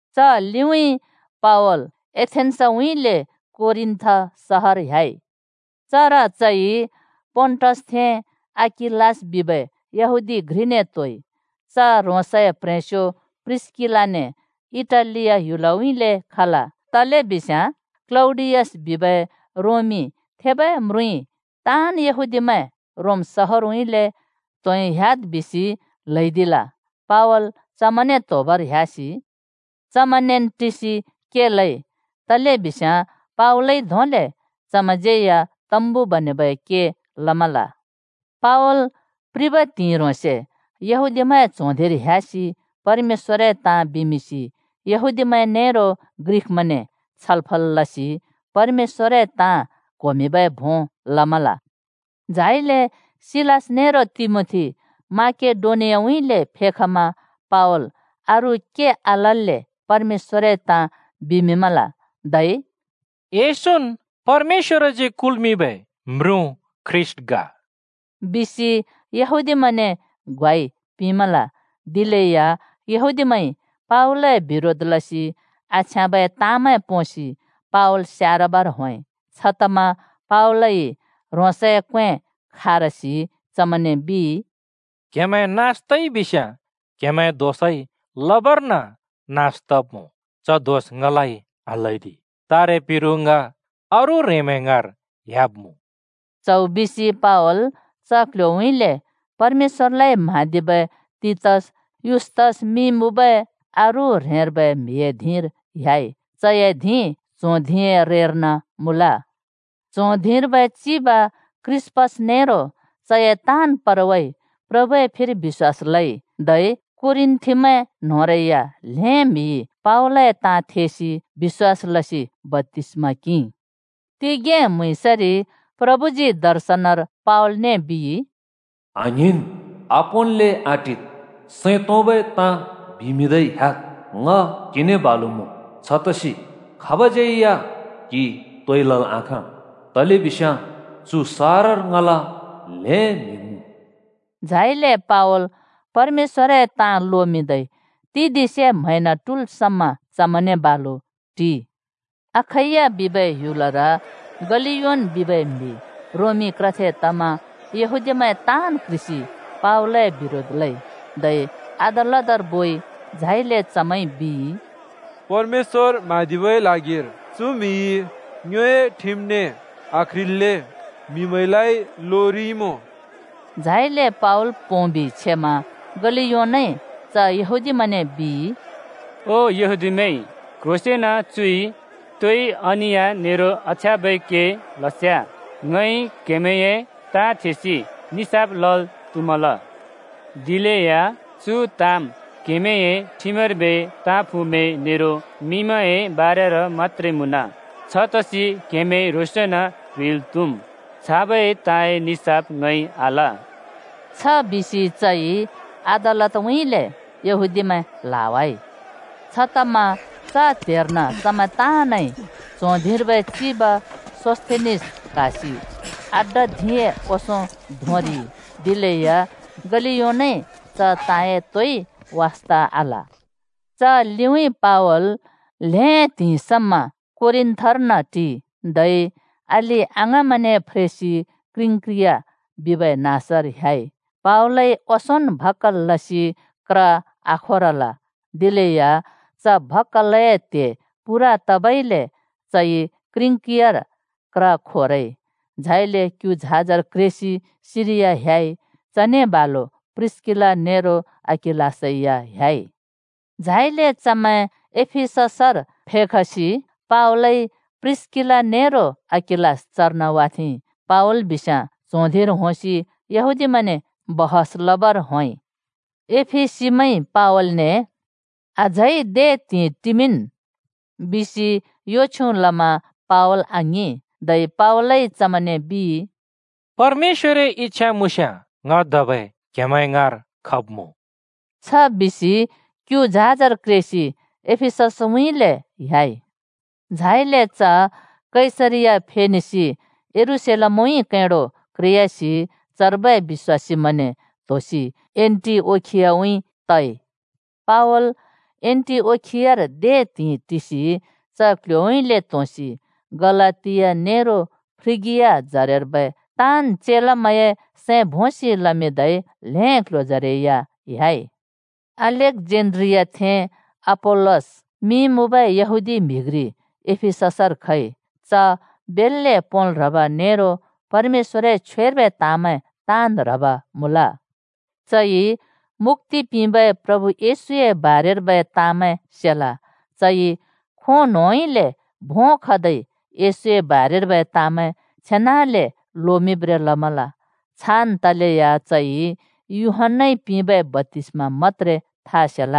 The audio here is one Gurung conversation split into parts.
च लिउँइँ पावल एथेन्‍सउँइँले कोरिन्‍थ सहर ह्‍याइ। चर चइ पोन्‍टसथें अकिलास बिबै यहूदी घ्रिने त्होइ। च ह्रोंसए प्ह्रेंस्यो प्रिस्‍किलाने इटालिया ह्‍युलउँइँले खल, तलेबिस्याँ क्‍लौडियस बिबै रोमी थेबै म्रुँइ ताँन् यहूदीमैं रोम शहारउँइँले त्होंइ ह्‍याद् बिसि ल्हैदिल। पावल चमैंने त्होबर ह्‍यासि चमैंनेन् टिसि के लइ, तलेबिस्याँ पावलइ धोंले चमैंज्यै या तम्बु बनेबै के लमल। पावल प्रिबै त्हिंइ ह्रोंसे यहूदीमैंए च्हों धिंर ह्‍यासि परमेश्‍वरए ताँ बिमिंसि यहूदीमैं नेरो ग्रिकमैंने ताँ छलफल लसि परमेश्‍वरए ताँ क्होमिंबै भों लमल। झाइले सिलास नेरो तिमोथी माकेडोनियाउँइँले फेखमा पावल अरू के आलल्‍ले परमेश्‍वरए ताँ बिमिंमल, धै “येशून् परमेश्‍वरजी कुल्मिंबै म्रुँ ख्रीष्‍ट ग!” बिसि यहूदीमैंने ग्वाइ पिंमल। दिलेया यहूदीमैंइ पावलए बिरोध लसि आछ्याँबै ताँमै पोंसि पावल स्यारबर होंइ। छतमा पावलइ ह्रोंसए क्वें खारसि चमैंने बिइ, “क्‍हेमैं नास तइबिस्‍याँ क्हेमैंए दोषइ लबर्न नास तब्मुँ, च दोष ङलाइ आल्‍हैदि। तारे पिरु ङ अरू ह्रेंमैं ङाँर ह्‍याब्मुँ।” च्हौ बिसि पावल च क्ल्ह्‍योउँइँले परमेश्‍वरलाइ म्‍हाँदिबै तीतस युस्‍तस मिं मुँबै अरू ह्रेंर्बै म्हिए धिंर ह्‍याइ। चए धिं च्हों धिंए रेर्न मुँल। च्हों धिंर्बै चिब क्रिस्‍पस नेरो चए ताँन् परवाइ प्रभुए फिर बिश्‍वास लइ, धै कोरिन्‍थिमैं न्होंरै या ल्हें म्हिइ पावलए ताँ थेइरि बिश्‍वास लसि बप्‍तिस्मा किंइ। तिगें म्‍हुँइँसरि प्रभुजी दर्शनर पावलने बिइ, “आङ्हिंन्! आपोंन्ले आटिद्, सैं तोंबै ताँ बिमिंदै ह्‍याद्। ङ क्हिने बालु मुँ। छतसि खाबज्यै या क्हि तोइ लल् आखाँ, तलेबिस्याँ चु सहरर ङला ल्हें म्हि मुँ।” झाइले पावल परमेश्‍वरए ताँ लोमिंदै तिदिंसे म्हैंन ट्हुल् समा चमैंने बालु टिइ। अखैया बिबै ह्‍युलर गलियोन बिबै म्हि रोमी क्रथे तमा यहूदीमैं ताँन् क्ह्रिसि पावलए बिरोध लइ, धै अदालतर बोइ। झाइले चमैंइ बिइ, “परमेश्‍वर म्हाँदिबै ल्हागिर चु म्हिइ ङ्योए ठिमने आक्ह्रिल्‍ले म्हिमैंलाइ लोमिंरिइमुँ।” झाइले पावल पोंबि छेमा गलियोनइ च यहूदीमैंने बिइ, “ओ यहूदीमैं, क्ह्रोंसेंन चुइ तोइ अनिया नेरो आछ्याँबै के लस्याँ ङइ क्हेमैंए ताँ थेसि निसाफ लल् त्हुमल। दिलेया चु ताँम् क्हेमैंए ठिमर्बै ताँफुँमैं नेरो मिंमैंए बारेर मत्‍त्रे मुँन! छतसि क्हेमैं ह्रोंसन् क्ह्रिल् त्हुम्। छाबै ताँए निसाफ ङइ आल।” छ बिसि चइ अदालतउँइँले यहूदीमैं ल्हावाइ। छतमा च त्हेर्न चमैं ताँनइ च्हों धिंर्बै चिब सोस्‍थेनिस क्हासि अड्डा धिंए ओंसों धोंरिइ। दिलेया गलियोनइ च ताँए तोइ वास्ता आल। च लिउँइँ पावल ल्हें त्हिंइ समा कोरिन्थर्न टिइ। धै अलि-अङाँमैंने फ्रेसि किंक्रिया बिबै नाँसर ह्‍याइ। पावलइ ओंसोंन् भक्‍कल लसि क्र आखोरल, दिलेया च भक्‍कलए त्हे पूरा तबइले चइ किंक्रियार क्र खोरइ। झाइले क्यु झाजर क्रेसि सिरिया ह्‍याइ। चने बालु प्रिस्‍किला नेरो अकिलासै या ह्‍याइ। झाइले चमैं एफिससर फेखसि पावलइ प्रिस्‍किला नेरो अकिलास चर्न वाथेंइ। पावल बिस्याँ च्हों धिंर होंसि यहूदीमैंने छलफल लबर होंइ। एफिसीमैंइ पावलने “अझै दे त्हिंइ टिमिंन्!” बिसि यो छ्युँ लमा पावल आङिं। धै पावलइ चमैंने बिइ, “परमेश्‍वरए इच्छा मुँस्याँ ङ धबै क्हेमैं ङाँर खब्मुँ।” छ बिसि क्यु झाजर क्रेसि एफिससउँइँले ह्‍याइ। झाइले च कैसरिया फेनेसि यरूशलेमउँइँ कैंडो क्रेयासि चर्बै बिश्‍वासीमैंने त्होसि एन्‍टिओखियाउँइँ तइ। पावल एन्‍टिओखियार दे त्हिंइ टिसि च क्ल्ह्‍योउँइँले त्होंसि गलातिया नेरो फ्रिगिया जरेर्बै ताँन् चेलामैं सैं भोंसि लमिंदै ल्हें क्ल्ह्‍योजरै या ह्‍याइ। अलेक्‍जेन्‍ड्रियाथें अपोल्‍लस मिं मुँबै यहूदी म्हि घ्रि एफिससर खइ। च बेल्‍ले पोंल् ह्रब नेरो परमेश्‍वरए छ्वेर्बै ताँमैं ताँन् ह्रब मुँल। चइ मुक्‍ति पिंबै प्रभु येशूए बारेरर्बै ताँमैं सेल। चइ खों न्होंउँइँले भों खदै येशूए बारेर्बै ताँमैं छेनाले लोमिंब्रें लमल। छान् तलेया चइ यूहन्‍नाइ पिंबै बप्‍तिस्मा मत्‍त्रे था सेल।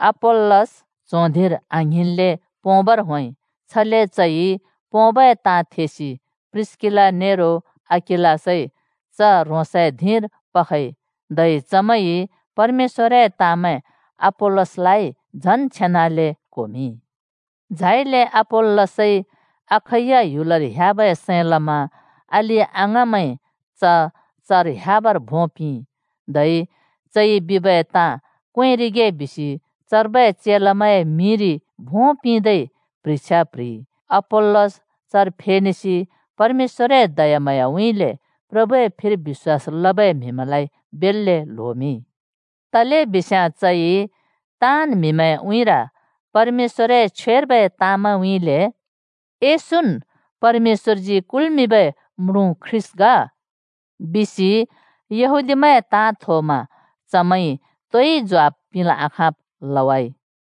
अपोल्‍लस च्हों धिंर आङ्हिंन्ले पोंबर होंइ। छले चइ पोंबै ताँ थेसि प्रिस्‍किला नेरो अकिलासइ च ह्रोसए धिंर पखइ, धै चमैंइ परमेश्‍वरए ताँमैं अपोल्‍लसलाइ झन् छेनाले क्होमिंइ। झाइले अपोल्‍लसइ अखैया ह्‍युलर ह्‍याबै सैं लमा अलि-अङाँमैंइ च चर ह्‍याबर भों पिंइ, धै चइ बिबै ताँ क्वेंरिगे बिसि चर्बै चेलामैंए मिंरि भों पिंदै प्ह्रिछ्या (चिट्ठि) प्ह्रिइ। अपोल्‍लस चर फेनेसि परमेश्‍वए दयाम्हाँयाउँइँले प्रभुए फिर बिश्‍वास लबै म्हिमैंलाइ बेल्‍ले ल्होमिंइ। तलेबिस्याँ चइ ताँन् म्हिमैंए उँइँर परमेश्‍वरए छ्वेर्बै ताँमैंउँइँले, “येशून् परमेश्‍वरजी कुल्मिंबै म्रुँ ख्रीष्‍ट ग,” बिसि यहूदीमैंए ताँ थोमा चमैंइ तोइ ज्वाफ पिंल् आखाँब् लइ।